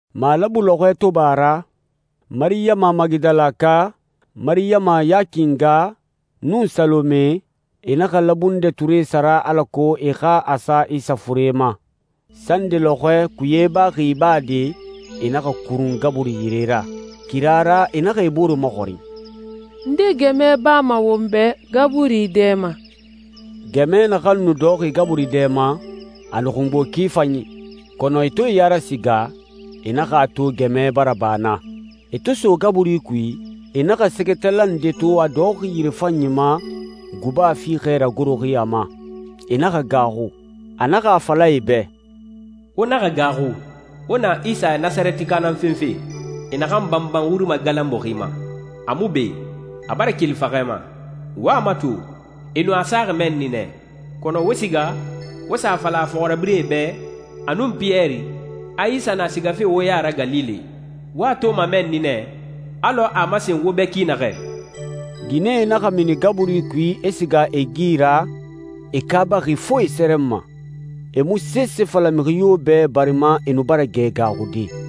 Malabu lɔxɔɛ to ba a ra, Mariyama Magidalaka, Mariyama Yaki nga, nun Salome, e naxa labundɛ ture sara alako e xa a sa Isa fure ma. Sande lɔxɔɛ, kuye baxi ibade, e naxa kurun gaburi yire ra. Kira ra, e naxa e bore maxɔrin, «Nde gɛmɛ bama won bɛ gaburi dɛ ma?» Gɛmɛ naxan nu dɔxɔxi gaburi dɛ ma, a nu xungbo ki fanyi. Kɔnɔ e to e ya rasiga, e naxa a to gɛmɛ bara ba naa. E to so gaburi kui, e naxa sɛgɛtala nde to a dɔxɔxi yirefanyi ma, guba fiixɛ ragoroxi a ma. E naxa gaaxu. A naxa a fala e bɛ, «Wo naxa gaaxu. Wo na Isa Nasarɛtika nan fenfe, e naxan banban wuri magalanbuxi ma. A mu be, a bara keli faxɛ ma. Wo a mato, e nu a saxi mɛnni nɛ. Kɔnɔ wo siga, wo sa a fala a fɔxirabirɛe bɛ, a nun Piyɛri, a Isa na sigafe wo ya ra Galile. Wo a toma mɛnni nɛ alɔ a a masen wo bɛ ki naxɛ.» Ginɛe naxa mini gaburi kui, e siga e gi ra, e kaabaxi fo e sɛrɛnma. E mu sese fala mixi yo bɛ, barima e nu bara gɛ gaaxude.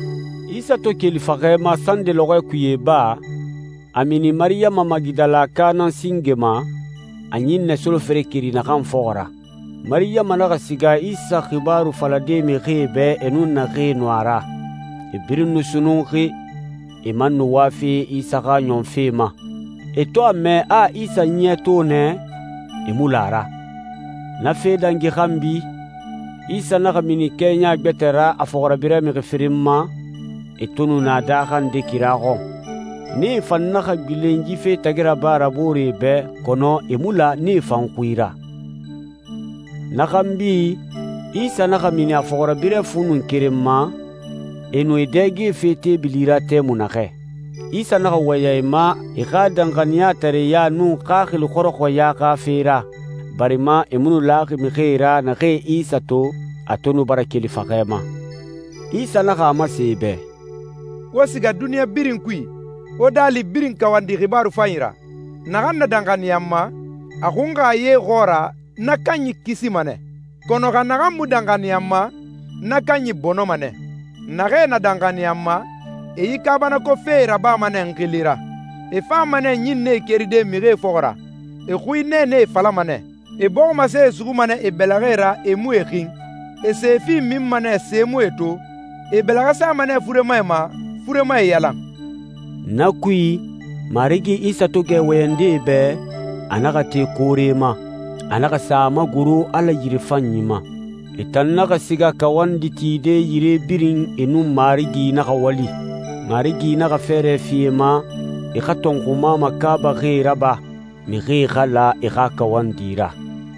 Isa to keli faxɛ ma sande lɔxɔɛ kuye iba, a mini Mariyama Magidalaka nan singe ma, a ɲinnɛ solofere keri naxan fɔxɔ ra. Mariyama naxa siga Isa xibaaru falade mixie bɛ e nun naxee nu a ra. E birin nu sunnunxi, e man nu wafe Isa xa ɲɔnfe ma. E to a mɛ a a Isa ɲiɲɛ to nɛ, e mu la a ra. Na fee dangi xanbi, Isa naxa mini kɛɲa gbɛtɛ ra a fɔxirabirɛ mixi firin ma, e to nu na daaxa nde kira xɔn. Nee fan naxa gbilen yi fe tagi raba ra booree bɛ, kɔnɔ e mu la nee fan xui ra. Na xanbi, Isa naxa mini a fɔxirabirɛ fu nun keren ma, e nu e dɛgefe teebili ra tɛmui naxɛ. Isa naxa wɔyɛn e ma e xa danxaniyatareɲa nun xaxili xɔrɔxɔya xa fe ra, barima e mu nu laxi mixie ra naxee Isa to, a to nu bara keli faxɛ ma. Isa naxa a masen e bɛ, «Wo siga duniɲa birin kui, wo daali birin kawandi xibaaru fanyi ra. Naxan na danxaniya n ma, a xunxa ye xɔɔra, na kanyi kisima nɛ. Kɔnɔ xa naxan mu danxaniya n ma, na kanyi bɔnɔma nɛ. Naxee na danxaniya n ma e yi kaabanako fee rabama nɛ n xili ra. E fama nɛ ɲinnɛe keride mixie fɔxɔ ra, e xui nɛɛnɛe falama nɛ, e bɔximasee suxuma nɛ e bɛlɛxɛ ra e mu e xin, e sefi minma nɛ se mu e to, e e bɛlɛxɛ sama nɛ furemae ma, furemae yalan.» Na kui, Marigi Isa to gɛ wɔyɛnde e bɛ, a naxa te koore ma. A naxa sa a magoro Ala yirefanyi ma. E tan naxa siga kawandi tide yire birin, e nun Marigi naxa wali. Marigi naxa fɛɛrɛ fi e ma, e xa tɔnxuma makaabaxie raba, mixie xa la e xa kawandi ra.